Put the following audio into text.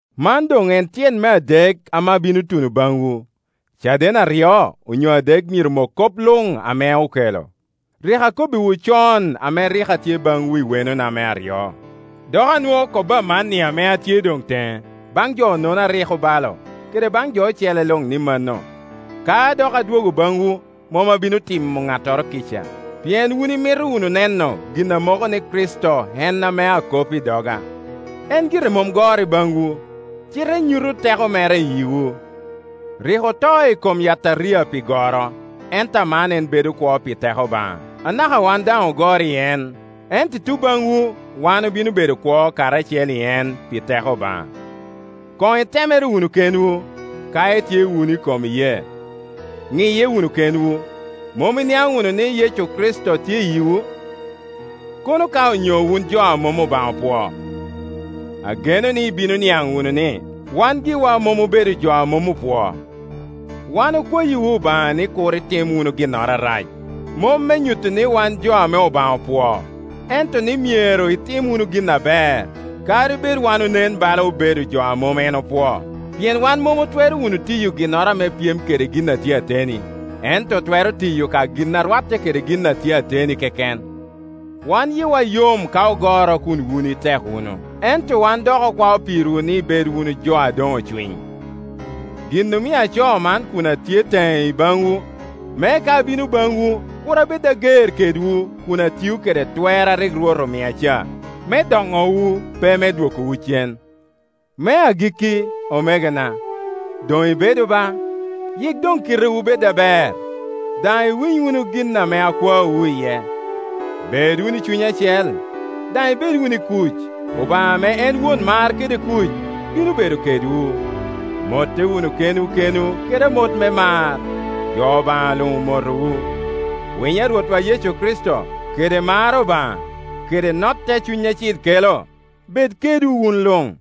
Man doŋ en tyen me adek ame abino tuno baŋwu. Caden aryo onyo adek myero mok kop luŋ ame okelo. Rik akobbiwu con ame rik atye baŋwu i wenona me aryo, dok anwoo kobo amanni ame atye doŋ teŋe, baŋ jo-nono a rik obalo, kede baŋ jo ocele luŋ, ni mano, ka dok adwogo baŋwu, mom abino timo ŋattoro kica, pien wun imito wunu neno gin a moko ni Kricito en ame akop i doga. En gire mom goro i baŋwu, cite nyuto teko mere i yiwu. Rik oto i kom yataria pi goro, ento aman en bedo kwo pi teko Obaŋa. Anaka wan daŋ ogoro i en, ento i tuŋ baŋwu wan obino bedo kwo karacel i en pi teko Obaŋa. Koŋ itemere wunu kenwu, ka itye wunu i kom iyee. Ŋiye wunu kenwu, Mom iniaŋ wunu ni Yecu Kricito tye i yiwu? Kono ka onyo wun jo a mom Obaŋa opwoo. Ageno ni ibino niaŋ wunu ni wan giwa mom obedo jo a mom opwoo. Wan okwayiwu Obaŋa ni kur itim wunu ginnoro arac, mom me nyuto ni wan jo ame Obaŋa opwoo, ento ni myero itim wunu gin aber, kadi bed wan onen bala obedo jo a mom en opwoo. Pien wan mom otwero wunu tiyo ginnoro ame pyem kede gin a tye ateni, ento otwero tiyo ka gin a rwatte kede gin a tye ateni keken. Wan yiwa yom ka ogoro kun wun itek wunu, ento wan dok okwao pirwu ni ibed wunu jo a doŋ ocwiny. Gin omio acoo man kun atye teŋe i baŋwu, me ka abino baŋwu kur abed ager kedwu kun atiyo kede twer a rik Rwot omia ca, me donowu, pe me dwokowu cen. Me agikki, omegona, doŋ ibedu ba, Yik doŋ kitewu bed aber, daŋ iwiny wunu gin ame akwaowu iye, Bed wunu i cuny acel, daŋ ibed wunu i kuc, Obaŋa ame en won mar kede kuc bino bedo kedwu. Motte wunu kenwu kenwu kede amot me mar. Jo Obaŋa luŋ omotowu. Winyo a Rwotwa Yecu Kricito, kede mar Obaŋa, kede notte a Cuny Acil kelo, bed kedwu wun luŋ,